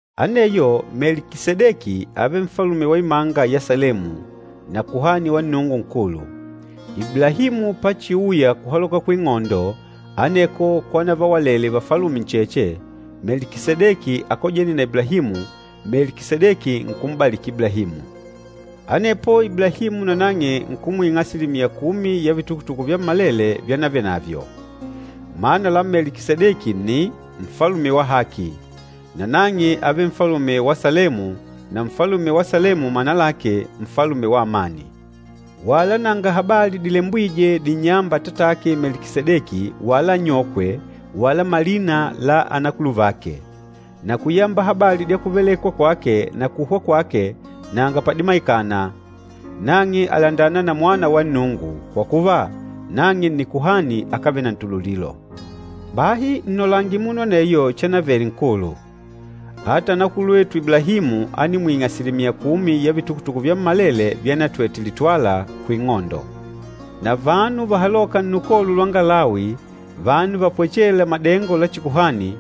Aneyo Melikisedeki ávele nfalume wa imanga ya Salemu, na kuhani wa Nnungu Nkulu. Iblahimu pachiuya kuhaloka kuing'ondo aneko kwanavawalele vafalume ncheche, Melikisedeki ákojene na Iblahimu, Melikisedeki nkum'baliki Iblahimu. Anepo Iblahimu nanang'e nkumwing'a asilimiya kumi ya vitukutuku vyammalele vyanavenavyo. Mana la Melikisedeki nni, “nfalume wa haki,” nanang'e ávele nfalume wa Salemu, na nfalume wa Salemu mana lake, “nfalume wa amani.” Wala nanga habali dilembwîje dinnyâmba atatake Melikisedeki wala anyokwe wala malina la anakuluvake. Na kuyamba habali dya kuvelekwa kwake na kuhwa kwake nanga padimaikana. Nang'e àlandana na Mwana wa Nnungu, kwa kuva, nang'e nni kuhani akávele na ntululilo. Bahi nnolange munu aneyo chanavele nkulu. Ata anakulwetu Iblahimu ánimwing'a asilimiya kumi ya vitukutuku vyammalele vyanatwete litwala kuing'ondo. Na vanu vahalôka nnukolo lwanga Lawi, vanu vapwechêla madengo la chikuhani,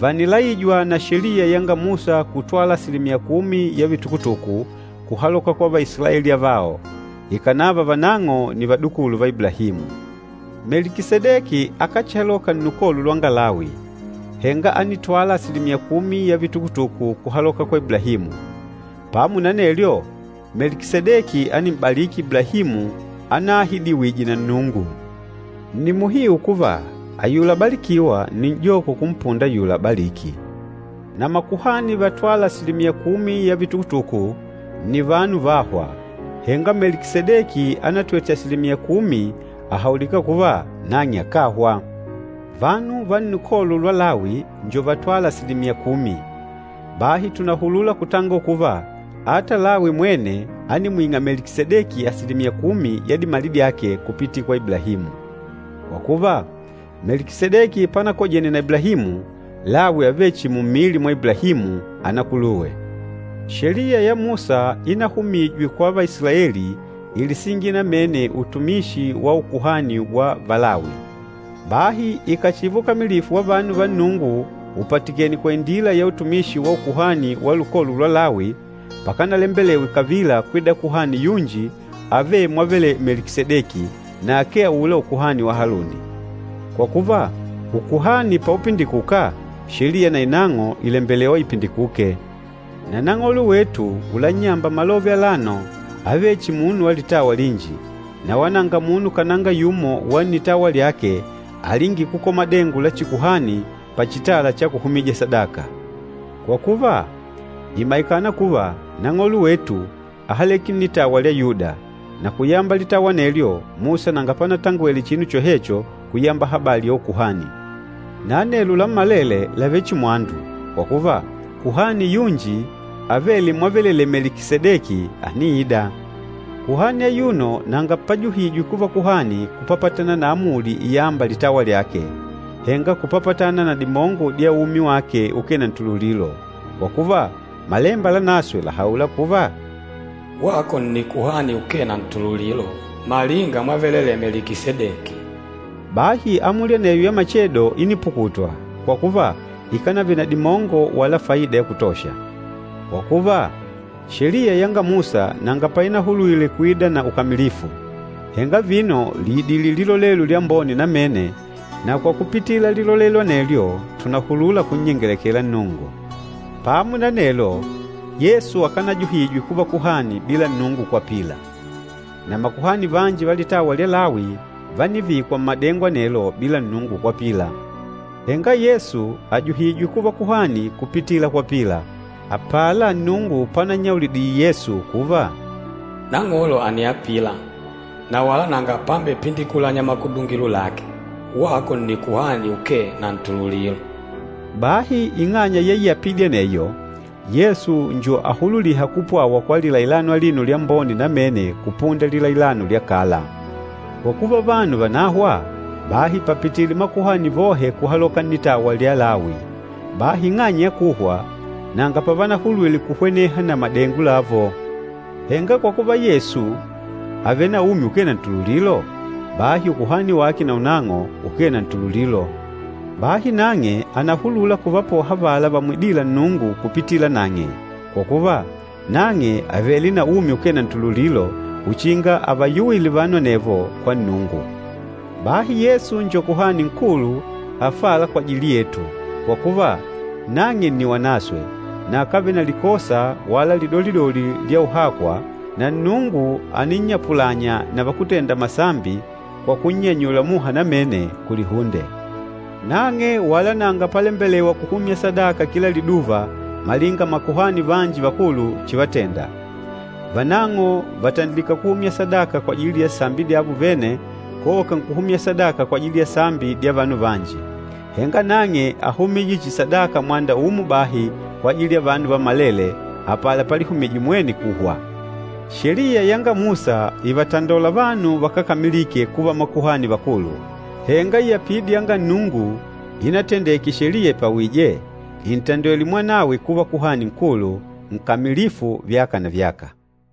vànilaijwa na Sheliya yanga Musa kutwala asilimiya kumi ya vitukutuku kuhaloka kwa Vaisilaeli avao, ikànava vanang'o nni vadukulu va Iblahimu. Melikisedeki akáchihaloka nnukolo lwanga Lawi, henga ánitwala asilimiya kumi ya vitukutuku kuhaloka kwa Iblahimu. Pamo na anelyo, Melikisedeki ánim'baliki Iblahimu anaahidiwije na Nnungu. Nni muhiu kuva ayula abalikîwa nni n'joko kumpunda ayula abalîki. Na makuhani vatwâla asilimiya kumi ya vitukutuku nni vanu vâhwa, henga Melikisedeki anatwete asilimiya kumi àhaulika kuva nang'e akáhwa. Vanu va lukolo lwa Lawi njo vatwâla asilimiya kumi. Bahi tùnahulula kutangola kuva, ata Lawi mwene ánimwing'a Melikisedeki asilimiya kumi ya dimali dyake kupitila kwa Iblahimu. Kwa kuva, Melikisedeki panakojene na Iblahimu, Lawi ávele chihi mummili mwa Iblahimu, anakuluwe. Sheliya ya Musa ínahumijwe kwa Vaisilaeli ílisingila namene utumishi wa ukuhani wa Valawi. Bahi ikàchiva ukamilifu wa vanu va Nnungu upatikènè kwa indila ya utumishi wa ukuhani wa lukolo lwa Lawi, pakanalembelewe kavila kwida kuhani yunji avêle mwavelelee Melikisedeki, na akee aula ukuhani wa Haluni. Kwa kuva, ukuhani paupindikuka, Sheliya na inang'o ìlembelewa ipindikuke. Na Nang'olo wetu ulannyamba malove alano ávele chihi munu wa litawa linji, na wala nanga munu kananga yumo wa nnitawa lyake alingîle kukola madengo la chikuhani pachitala cha kuhumija sadaka. Kwa kuva, ìmaikana kuva Nang'olo wetu áhaleke nnitawa lya Yuda, na kuyamba litawa anelyo Musa nanga panatangwele chinu chohecho kuyamba habali ya ukuhani. Na anelo lammalele làvele chihi mwandu, kwa kuva, kuhani yunji avêle mwavelelee Melikisedeki àniida. Kuhani ayuno nanga pajuhijwe kuva kuhani kupapatana na amuli iyâmba litawa lyake, henga kupapatana na dimongo dya umi wake ukee na ntululilo. Kwa kuva, Malemba Lanaswe làhaula kuva, “Wako nni kuhani ukee na ntululilo, malinga mwavelelee Melikisedeki.” Bahi amuli aneyo ya machedo ínipukutwa, kwa kuva, ikánavele na dimongo wala faida ya kutosha. Kwa kuva, Sheliya yanga Musa nanga painahulwile kuida na ukamilifu. Henga vino lìidile lilolelo lyambone namene, na kwa kupitila lilolelo anelyo tùnahulula kunnyengelekela Nnungu. Pamo na anelo, Yesu akanajuhijwe kuva kuhani bila Nnungu kwapila. Na makuhani vanji va litawa lya Lawi vánivikwa mmadengo anelo bila Nnungu kwapila. Henga Yesu àjuhijwe kuva kuhani kupitila kwapila, apala Nnungu panannyaulidile Yesu kuva, “Nang'olo àniapila, na wala nanga pambepindikulanya makudungilo lake, ‘Wako nni kuhani ukee na ntululilo.’” Bahi ing'anya ya iapidi aneyo, Yesu njo ahululîha kupwawa kwa lilailano alino lyambone namene kupunda lilailano lya kala. Kwa kuva vanu vànahwa, bahi pàpitile makuhani vohe kuhaloka nnitawa lya Lawi. Bahi ing'anya ya kuhwa, nanga pavanahulwile kuhweneha na madengo lavo. Henga kwa kuva Yesu àvele na umi ukee na ntululilo, bahi ukuhani wake naunang'o ukee na ntululilo. Bahi nang'e ànahulula kuvapoha avala vamwidîla Nnungu kupitila nang'e, kwa kuva, nang'e àvele na umi ukee na ntululilo uchinga avayuwile vanu anevo kwa Nnungu. Bahi Yesu njo Kuhani Nkulu afâla kwajili yetu, kwa kuva, nang'e nni wanaswe na akávele na likosa wala lidolidoli lya uhakwa na Nnungu àninnyapulanya na vakútenda masambi kwa kunnyanyula muha namene kulihunde. Nang'e wala nanga palembelewa kuhumya sadaka kila liduva malinga Makuhani vanji Vakulu chivatenda. Vanang'o vàtandilika kuhumya sadaka kwajili ya sambi dyavo vene, koka nkuhumya sadaka kwajili ya sambi dya vanu vanji. Henga nang'e áhumije chihi sadaka mwanda umo bahi kwajili ya vanu vammalele, apala palihumije mwene kuhwa. Sheliya yanga Musa ìvatandola vanu vakákamilike kuva Makuhani Vakulu, henga iapidi yanga Nnungu inatendeke Sheliya ipwawìjè, ìntandwele Mwanawe kuva Kuhani Nkulu, nkamilifu vyaka na vyaka.